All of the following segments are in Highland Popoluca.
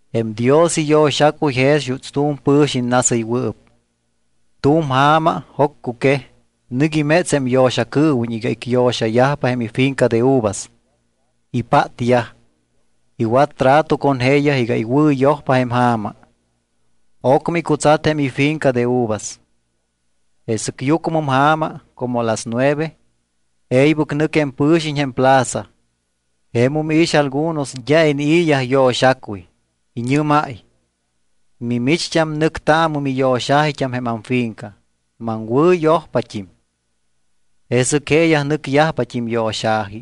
’Jém Dios iyo̱xacuy jex juuts tu̱m pɨ̱xiñ nasɨywɨɨp. Tu̱m ja̱ma, joccuquej, nɨc iméts jém yo̱xacɨɨwiñ iga icyo̱xayajpa jém ifinca de uvas. Ipátyaj, iwat trato con jeeyaj iga iwɨ̱yojpa jém ja̱ma. Ocmɨ icutsat jém ifinca de uvas. Jesɨc yucmɨm ja̱ma, como las nueve, e̱ybɨc nɨc jém pɨ̱xiñ jém plaza. Jemum iix algunos d́a inii̱yaj yo̱xacuy. Iñɨ́máy: “Mimicht́am nɨctaamɨ miyo̱xa̱jit́am jém amfinca. Maŋwɨ̱yojpat́im.” Jesɨc jeeyaj nɨcyajpat́im yo̱xa̱ji.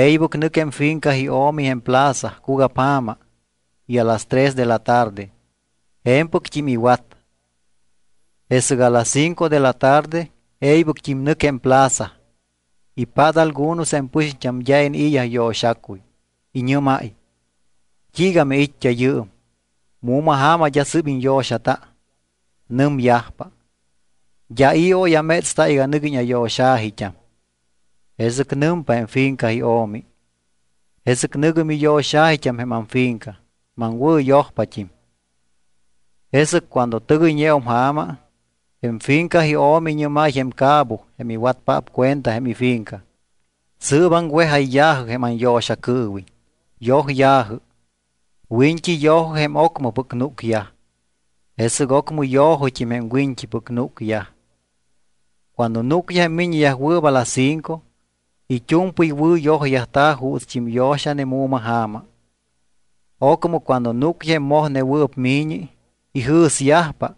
E̱ybɨc nɨc jém finca io̱mi jém plaza cugapja̱ma y a las tres de la tarde. Je̱mpɨct́im iwat. Jesɨc a las cinco de la tarde e̱ybɨct́im nɨc jém plaza. Ipát algunos jém pɨxiñt́am d́a inii̱yaj yo̱xacuy. Iñɨ́máy: “¿T́iiga miit́t́a yɨɨm? ¿Mu̱ma ja̱ma d́a sɨ́p iñyo̱xata?” Nɨmyajpa: “D́a i̱ oy amétsta iga nɨguiñ ayo̱xa̱jit́am.” Jesɨc nɨmpa jém finca io̱mi: “Jesɨc nɨ̱gɨ miyo̱xa̱jit́am jém amfinca. Maŋwɨ̱yojpat́im.” ’Jesɨc cuando tɨgɨyñeum ja̱ma, jém finca io̱mi iñɨ́máy jém cabo jém iwatpaap cuenta jém ifinca: “Sɨɨp aŋwejayyajɨ jém anyo̱xacɨɨwiñ, yojya̱jɨ. Wiñt́i yo̱jɨ jém ocmɨpɨc núcyaj. Jesɨc ocmɨ yo̱jɨt́im jém wiñt́ipɨc núcyaj.” Cuando núcyaj jém miññeyajwɨɨp a las cinco, it́u̱mpɨy wɨ̱yojyajta̱ juutst́im yo̱xane mu̱ma ja̱ma. Ocmɨ cuando núcyaj jém mojnewɨɨp mi̱ñi, ijɨ̱syajpa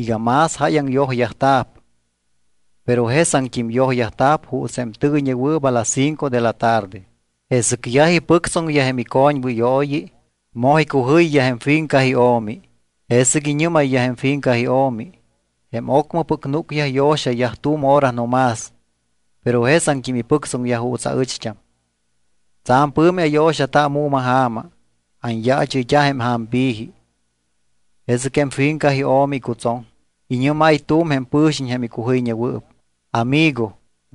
iga más jáyaŋ yojyajta̱p. Pero jesaŋt́im yojyajta̱p juuts jém tɨgɨyñewɨɨp a las cinco de la tarde. Jesɨc yaj ipɨctsoŋyaj jém icoñwɨyooyi, moj icujɨyyaj jém finca io̱mi. Jesɨc iñɨ́mayyaj jém finca io̱mi: “Jém ocmɨpɨc núcyaj yo̱xayaj tu̱m hora no más, pero jesaŋt́im ipɨctsoŋyaj juuts aɨcht́am. Tsa̱m pɨ̱mi ayo̱xata mu̱ma ja̱ma, anyaachɨyt́a jém ja̱mpi̱ji.” Jesɨc jém finca io̱mi icutsoŋ. Iñɨ́máy tu̱m jém pɨ̱xiñ jém icujɨyñewɨɨp: “Amigo,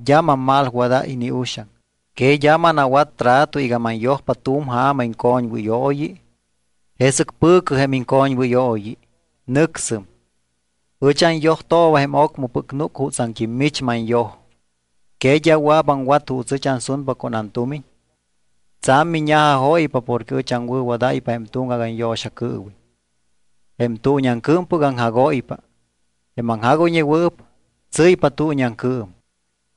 d́a mammalwaday ni uxaŋ. ¿Que d́a manawat trato iga manyojpa tu̱m ja̱ma icoñwɨyooyi? Jesɨc pɨ̱cɨ jém iŋcoñwɨyooyi, nɨcsɨm. Ɨch anyojtooba jém ocmɨpɨc núc jutsaŋt́im mich manyoj. ¿Que d́a wɨa̱p aŋwat juuts ɨch ansunpa con antumiñ? Tsa̱m miña̱jajóypa porque ɨch aŋwɨ̱wadáypa jém tuŋgac anyo̱xacɨɨwiñ.” Jém tuuñiaŋcɨɨmpɨc aŋjagóypa. Jém aŋjagoyñewɨɨp tsɨ́ypa tuuñiaŋcɨɨm.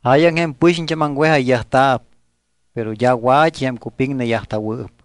Jáyaŋ jém pɨxiñt́am aŋwejayyajta̱p, pero d́a wa̱t́i jém cupiŋneyajta̱wɨɨp.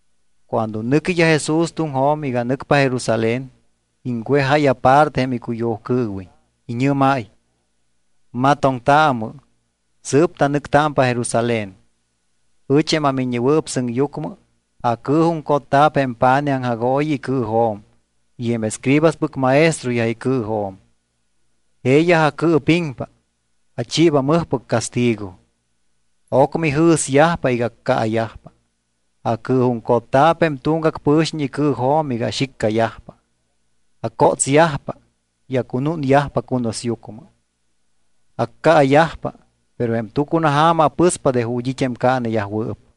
Cuando nɨquiyaj Jesús tuŋjo̱m iga nɨcpa Jerusalén, iŋwejáy aparte jém icuyujcɨɨwiñ. Iñɨ́máy: —Matoŋtaamɨ. Sɨɨp tanɨctámpa Jerusalén. Ɨch, jém aMiññewɨɨp Sɨŋyucmɨ, acɨɨjuŋcotta̱p jém pa̱nij aŋjagooyi icɨɨjo̱m y jém escribaspɨc maestroyaj icɨɨjo̱m. Jeeyaj acɨɨpiŋpa, achiiba mɨjpɨc castigo. Ocmɨ ijɨ̱syajpa iga accaayajpa. Acɨɨjuŋcotta̱p jém tuŋgac pɨ̱xiñ icɨɨjo̱m iga axiccayajpa, acótsyajpa y acunúnyajpa cunusyucmɨ. Accaayajpa, pero jém tucunaja̱ma apɨspa de ju̱t́ it́ jém caaneyajwɨɨp.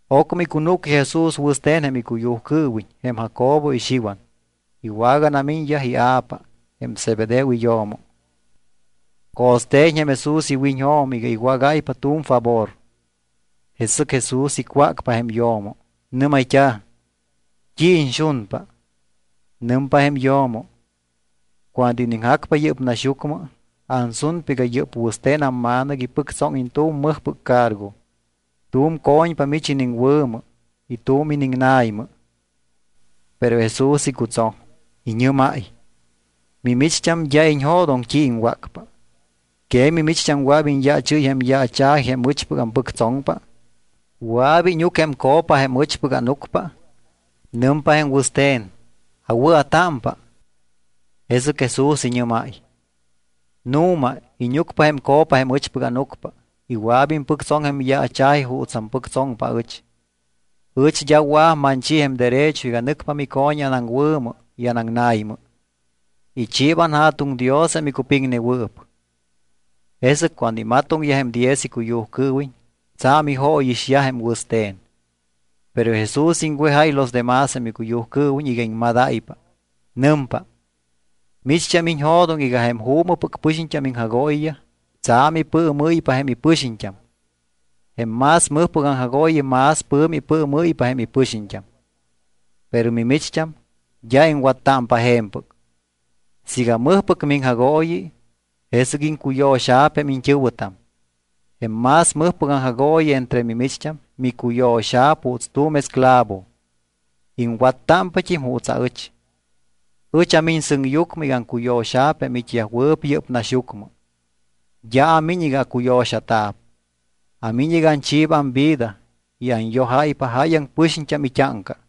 Ocmɨ icunúcyaj Jesús wɨste̱n jém icuyujcɨɨwiñ jém Jacobo y Xiwan. Iwaganamiñyaj ia̱pa, jém Zebedeo iyo̱mo. Co̱ste̱ñ jém Jesús iwiñjo̱m iga iwágáypa tu̱m favor. Jesɨc Jesús icwácpa jém yo̱mo. Nɨ́mayt́a̱: —¿T́i iñxunpa? Nɨmpa jém yo̱mo: —Cuando iniŋjacpa yɨ́p naxyucmɨ, ansunpa iga yɨ́p wɨste̱n amma̱nɨc ipɨctsóŋiñ tu̱m mɨjpɨc cargo. Tu̱m co̱ñpa mich iniŋwɨ̱mɨ y tu̱m iniŋna̱ymɨ. Pero Jesús icutsoŋ, iñɨ́máy: —Mimicht́am d́a iñjo̱doŋtam t́i iŋwácpa. ¿Que mimicht́am wɨa̱p iñyaachɨ́y jém yaacha̱ji jém ɨchpɨc ampɨctsoŋpa? ¿Wɨa̱p íñuc jém copa jém ɨchpɨc ánucpa? Nɨmpa jém wɨste̱n: —Awɨa̱támpa. Jesɨc Jesús iñɨ́máy: —Nu̱ma íñucpa jém copa jém ɨchpɨc ánucpa y wɨa̱p impɨctsoŋ jém yaacha̱ji juuts ampɨctsoŋpa aɨch. Ɨch d́a wɨa̱p manchi jém derecho iga nɨcpa mico̱ñi anaŋwɨ̱mɨ y anaŋna̱ymɨ. Ichiiba anJa̱tuŋ Dios jém icupiŋnewɨɨp. Jesɨc cuando imatoŋyaj jém diez icuyujcɨɨwiñ, tsa̱m ijóyixyaj jém wɨste̱n. Pero Jesús iŋwejáy los demás jém icuyujcɨɨwiñ iga iŋmadáypa. Nɨmpa: —Micht́am iñjo̱doŋ iga jém juumɨpɨc pɨxiñt́am iŋjagooyiyaj tsa̱m ipɨɨmɨ́ypa jém ipɨxiñt́am. Jém más mɨjpɨc aŋjagooyi más pɨ̱mi ipɨɨmɨ́ypa jém ipɨxiñt́am. Pero mimicht́am d́a iŋwattámpa je̱mpɨc. Siiga mɨjpɨc miŋjagooyi, jesɨc iŋcuyo̱xa̱p jém iñt́ɨ̱wɨtam. Jém más mɨjpɨc aŋjagooyi entre mimicht́am micuyo̱xa̱p juuts tu̱m esclavo. Iŋwattámpat́im juuts aɨch. Ɨch amiñ sɨŋyucmɨ iga aŋcuyo̱xa̱p jém it́yajwɨɨp yɨ́p naxyucmɨ. D́a amiñ iga acuyo̱xata̱p. Amiñ iga anchiiba amvida iga anyojáypa jáyaŋ pɨxiñt́am it́áŋca.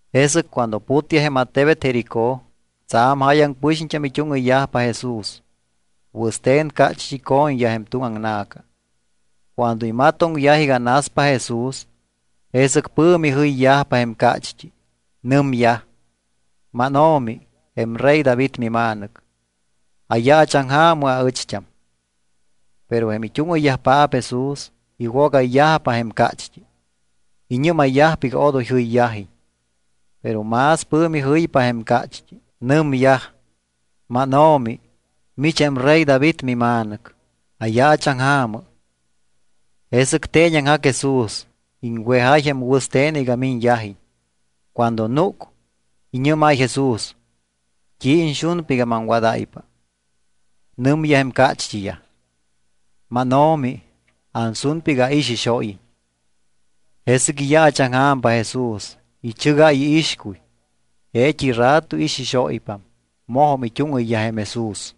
Jesɨc cuando putyaj jém attebet Jericó, tsa̱m jáyaŋ pɨxiñt́am it́úŋɨyyajpa Jesús. Wɨste̱n cácht́i co̱ñyaj jém tuŋ aŋna̱ca. Cuando imatoŋyaj iga naspa Jesús, jesɨc pɨ̱mi jɨyyajpa jém cácht́i. Nɨmyaj: —MánO̱mi, jém rey David mima̱nɨc, ayaachaŋja̱mɨ aɨcht́am. Pero jém it́úŋɨyyajpaap Jesús iwogayyajpa jém cácht́i. Iñɨ́mayyajpa iga odoy jɨyyajiñ. Pero más pɨ̱mi jɨypa jém cácht́i. Nɨmyaj: —MánO̱mi, mich jém rey David mima̱nɨc, ayaachaŋja̱mɨ. Jesɨc teeñaŋjac Jesús. Iŋwejáy jém wɨste̱n iga miñyajiñ. Cuando núc, iñɨ́máy Jesús: —¿T́i iñxunpa iga maŋwadáypa? Nɨmyaj jém cácht́iyaj: —MánO̱mi, ansunpa iga aixixóyiñ. Jesɨc iyaachaŋja̱mpa Jesús. Ichɨgáy iixcuy. Jeet́i rato ixixóypam. Mojum it́úŋɨyyaj jém Jesús.